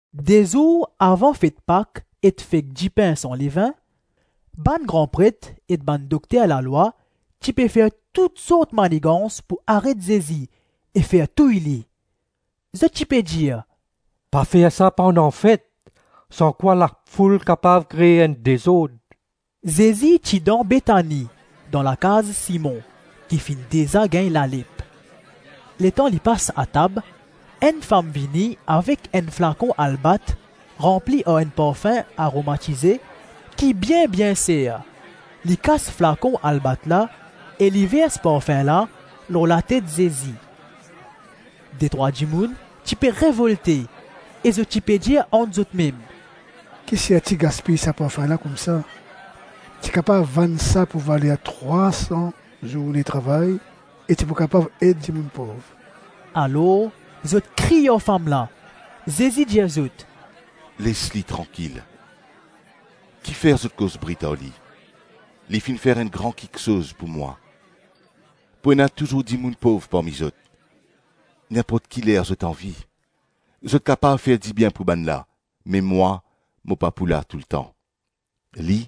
De zour avan fet Pak ek fet Dipin san levin, bann gran pret ek bann dokter lalwa ti pe fer tout sort manigans pou aret Zezi e fer touy li. Zot ti pe dir, “Pa fer sa pandan fet, sankwa lafoul kapav kre enn dezord.” Zezi ti dan Betani, dan lakaz Simon, ki finn deza gagn lalep. Letan li pas atab, enn fam vini avek enn flakon albat, ranpli ar enn parfin aromatize ki bien-bien ser. Li kas flakon albat la e li vers parfin la lor latet Zezi. Detrwa dimoun ti pe revolte e zot ti pe dir ant zot mem, “Ki serti gaspiy sa parfin la koumsa? Ti kapav vann sa pou valer trwasan zourne travay e ti pou kapav ed dimoun pov.” Alors zot kriy ar fam la. Zezi dir zot, “Les li trankil; ki fer zot koz brit ar li? Li finn fer enn gran kiksoz pou mwa. Pou ena touzour dimoun pov parmi zot; ninport ki ler zot anvi, zot kapav fer dibien pou bannla, me mwa, mo pa pou la toultan. Li,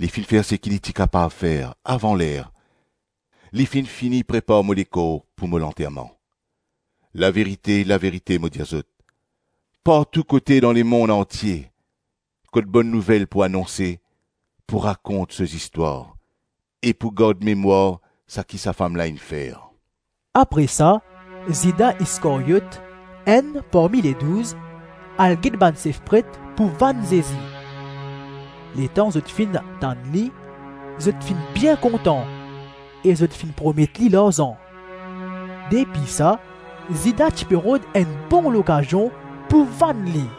li finn fer seki li ti kapav fer; avan ler, li finn fini prepar mo lekor pou mo lanterman. Laverite, laverite mo dir zot, partou kote dan lemonn antie kot Bonn Nouvel pou anonse, pou rakont so zistwar e pou gard memwar saki sa fam la inn fer.” Apre sa, Zida Iskaryot, enn parmi Ledouz, al get bann sef pret pou vann Zezi. Letan zot finn tann li, zot finn bien kontan e zot finn promet li larzan. Depi sa, Zida ti pe rod enn bon lokazion pou vann li.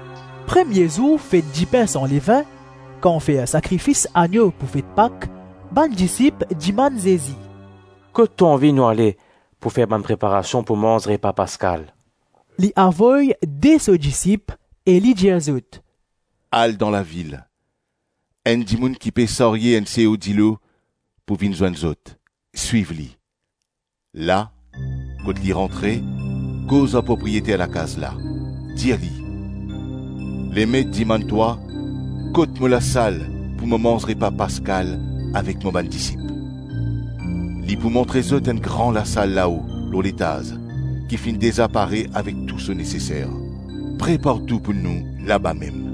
Premie zour fet Dipin san levin, kan fer sakrifis annyo pou fet Pak, bann disip dimann Zezi, “Kot to anvi nou ale pou fer bann preparasion pou manz repa paskal?” Li avoy de so disip e li dir zot, “Al dan lavil; enn dimoun ki pe sarye enn seo dilo pou vinn zwenn zot; swiv li. La, kot li rantre, koz ar propriyeter lakaz la, dir li, ‘Lemet dimann twa, kot mo lasal pou mo manz repa paskal avek mo bann disip?’ Li pou montre zot enn gran lasal lao lor letaz ki finn deza pare avek tou so neseser. Prepar tou pou nou labamem.”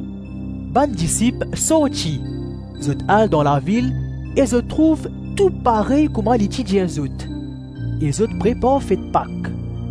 Bann disip sorti, zot al dan lavil e zot trouv tou parey kouma li ti dir zot, e zot prepar fet Pak.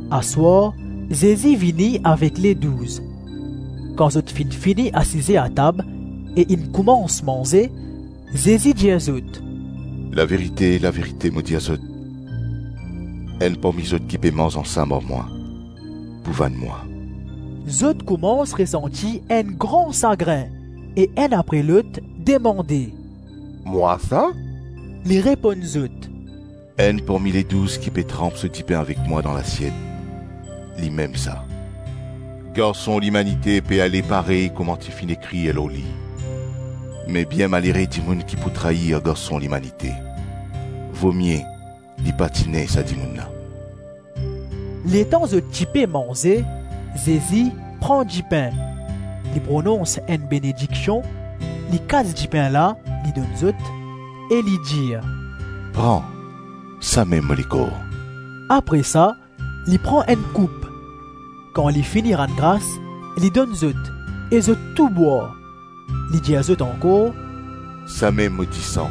Aswar, Zezi vini avek Ledouz. Kan zot finn fini asize atab e inn koumans manze, Zezi dir zot, “Laverite, laverite mo dir zot, enn parmi zot ki pe manz ansam ar mwa, pou vann mwa.” Zot koumans resanti enn gran sagrin e enn apre lot demande, “Mwa sa?” Li reponn zot, “Enn parmi Ledouz ki pe tranp so dipin avek mwa dan lasiet, limem sa. Garson Limanite pe ale parey kouma ti finn ekrir lor li; me bien malere dimoun ki pou trair Garson Limanite. Vomie li pa ti ne sa dimoun la.” Letan zot ti pe manze, Zezi pran dipin, li pronons enn benediksion, li kas dipin la, li donn zot, e li dir, “Pran, samem mo lekor.” Apre sa, li pran enn koup, kan li fini rann gras, li donn zot e zot tou bwar. Li dir zot ankor, “Sa mem mo disan,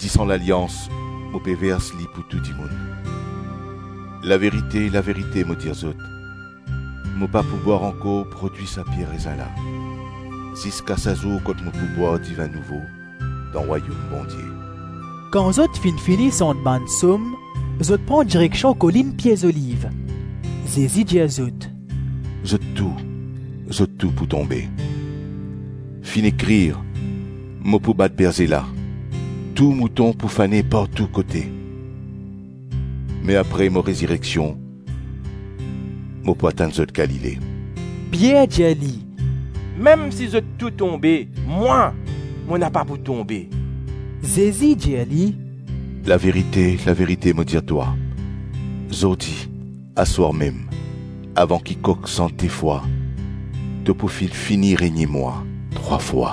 disan lalians; mo pe vers li pou tou dimoun. Laverite, laverite mo dir zot, mo pa pou bwar ankor prodwi sa pie rezin la, ziska sa zour kot mo pou bwar divin nouvo dan Rwayom Bondie.” Kan zot finn fini sant bann Psom, zot pran direksion Kolinn Pie Zoliv. Zezi dir zot, “Zot tou, zot pou tonbe; finn ekrir, ‘Mo pou bat berze la, tou mouton pou fane partou kote.’ Me apre mo rezireksion, mo pou atann zot Galile.” Pier dir li, “Mem si zot tou tonbe, mwa, mo napa pou tonbe.” Zezi dir li, “Laverite, laverite mo dir twa, zordi, aswar mem, avan ki kok sant de fwa to pou finn fini renie mwa trwa fwa.”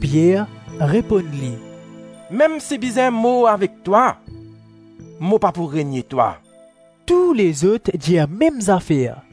Pier reponn li, “Mem si bizin mor avek twa, mo pa pou renie twa.” Tou lezot dir mem zafer.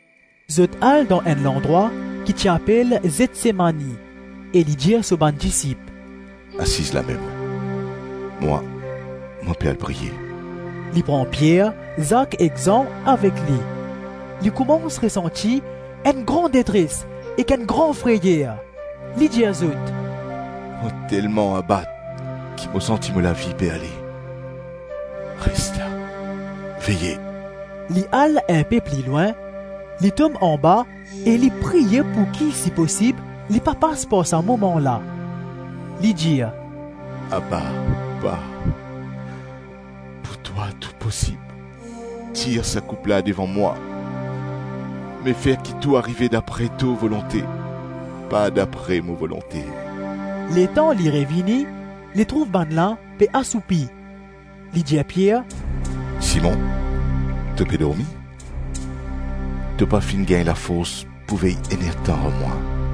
Zot al dan enn landrwa ki ti apel Zetsemani e li dir so bann disip, “Asiz lamem, mwa, mo pe al priye.” Li pran Pier, Zak ek Zan avek li; li koumans resanti enn gran detres ek enn gran freyer. Li dir zot, “Mo telman abat ki mo santi mo lavi pe ale; res la, veye.” Li al inpe pli lwin, li tom anba e li priye pouki si posib, li pa pas par sa moman la. Li dir, “Abba! Pa! Pou twa tou posib; tir sa koup la devan mwa, me fer ki tou arive dapre to volonte, pa dapre mo volonte.” Letan li revini, li trouv bannla pe asoupi. Li dir Pier, “Simon, to pe dormi? To pa finn gagn lafors pou vey enn er-tan ar mwa?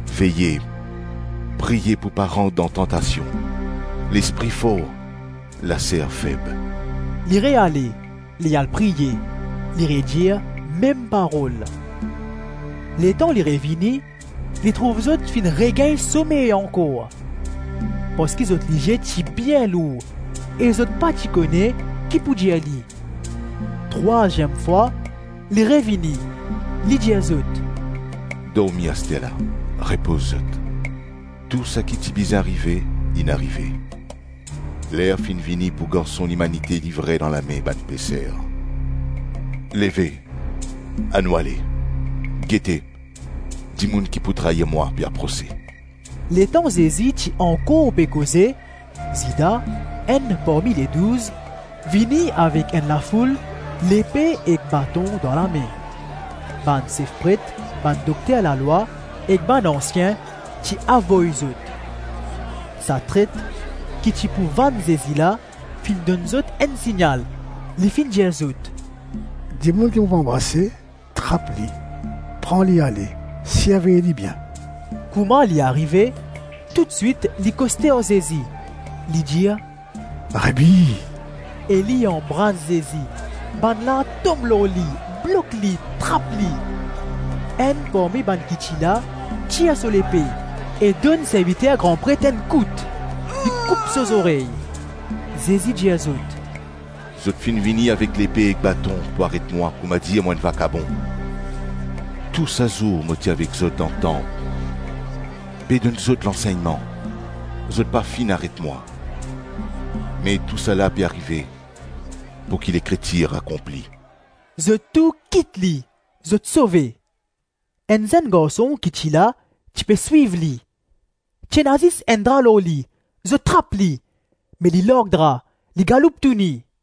Veye, priye pou pa rant dan tantasion; lespri for, laser feb.” Li reale, li al priye; li redir mem parol. Letan li revini, li trouv zot finn regagn somey ankor, parski zot lizie ti bien lour e zot pa ti kone ki pou dir li. Trwaziem fwa li revini, li dir zot, “Dormi asterla, repoz zot, tou saki ti bizin arive, inn arive. Ler finn vini pou Garson Limanite livre dan lame bann peser. Leve, anou ale. Gete, dimoun ki pou trair mwa pe aprose.” Letan Zezi ti ankor pe koze, Zida, enn parmi Ledouz, vini avek enn lafoul, lepe ek baton dan lame. Bann sef pret, bann dokter lalwa ek bann ansien ti avoy zot. Sa tret ki ti pou vann Zezi la, finn donn zot enn signal, li finn dir zot, “Dimoun ki mo pou anbrase, trap li, pran li ale, sirvey li bien.” Kouma li arive, toutswit li koste ar Zezi, li dir, “Rabi,” -e li anbras Zezi. Bannla tom lor li, blok li, trap li. Enn parmi bann ki ti la, tir so lepe e donn serviter gran pret enn kout. Li koup so zorey. Zezi dir zot, “Zot finn vinn avek lepe ek baton pou aret mwa koumadir mo enn vakabon? Tou sa zour mo ti avek zot dan tanp, pe donn zot lansegnman, zot pa finn aret mwa. Me tousala pe arive pouki Lekritir akonpli.” Zot tou kit li, zot sove. Enn zenn garson ki ti la, ti pe swiv li. Ti ena zis enn dra lor li; zot trap li. Me li larg dra, li galoup touni.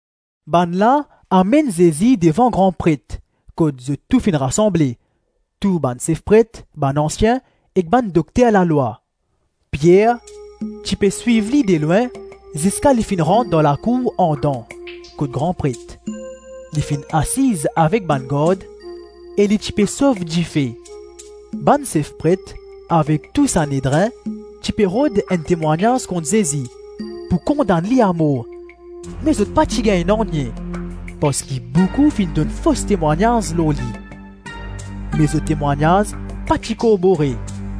Bannla amenn Zezi devan gran pret, kot zot tou finn rasanble: tou bann sef pret, bann ansien ek bann dokter lalwa. Pier ti pe swiv li delwin ziska li finn rant dan lakour andan, kot gran pret. Li finn asiz avek bann gard e li ti pe sof dife. Bann sef pret avek tou Sanedrin ti pe rod enn temwagnaz kont Zezi pou kondann li amor, me zot pa ti gagn nanye; parski boukou finn donn fos temwagnaz lor li, me zot temwagnaz pa ti korbore.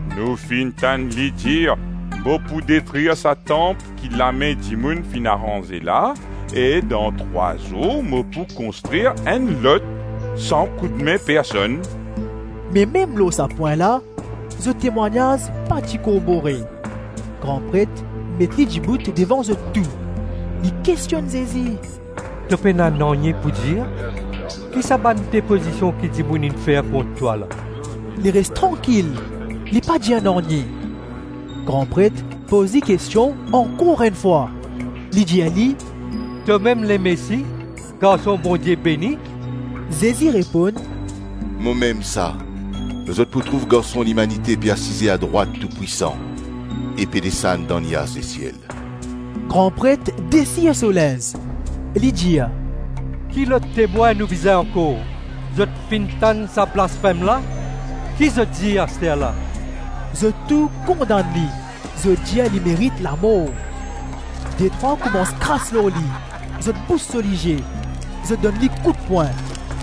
“Nou finn tann li dir ‘Mo pou detrir sa tanp ki lame dimoun finn aranze la, e dan trwa zour mo pou konstrir enn lot san koudme personn.’” Me mem lor sa pwin la, zot temwagnaz pa ti korbore. Gran pret met li dibout devan zot tou, li kestionn Zezi, “To pena nanye pou dir? Ki sa bann depozision ki dimoun inn fer kont twa la?” Li res trankil, li pa dir nanye. Gran pret poz li kestion ankor enn fwa, li dir li, “Tomem Lemesi, Garson Bondie beni?” Zezi reponn, “Momem sa; zot pou trouv Garson Limanite pe asize adrwat Toupwisan e pe desann dan niaz lesiel.” Gran pret desir so linz, li dir, “Ki lot temwin nou bizin ankor? Zot finn tann sa blasfem la? Ki zot dir asterla?” Zot tou kondann li, zot dir li merit lamor. Detrwa koumans kras lor li, zot bous so lizie, zot donn li koutpwin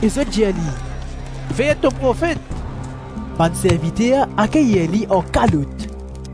e zot dir li, “Fer to profet!” Bann serviter akeyir li ar kalot.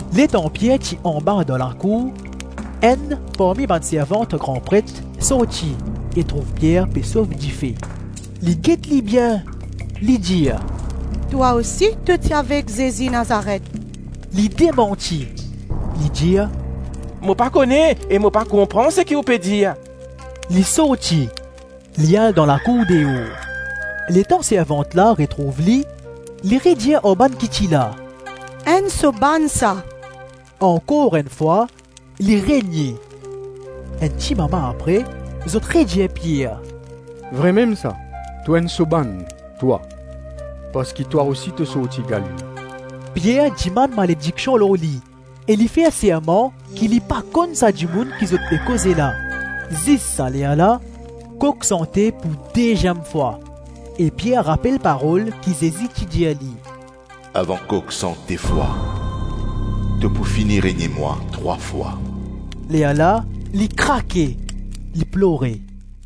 Letan Pier ti anba dan lakour, enn parmi bann servant gran pret sorti e trouv Pier pe sof dife. Li get li bien, li dir, “Twa osi to ti avek Zezi Nazaret.” Li demanti, li dir, “Mo pa kone e mo pa konpran seki ou pe dir.” Li sorti li al dan lakour deor. Letan servant la retrouv li, li redir ar bann ki ti la, “Enn so bann sa.” Ankor enn fwa li renie. Enn timama apre, zot redir Pier, “Vrememsa, to enn so bann, twa; parski twa osi to sorti Galile.” Pier dimann malediksion lor li e li fer serman ki li pa konn sa dimoun ki zot pe koze la. Zis sa lerla, kok sante pou deziem fwa e Pier rapel parol ki Zezi ti dir li, ‘Avan kok sant de fwa to pou fini renie mwa trwa fwa.’ Lerla li krake, li plore.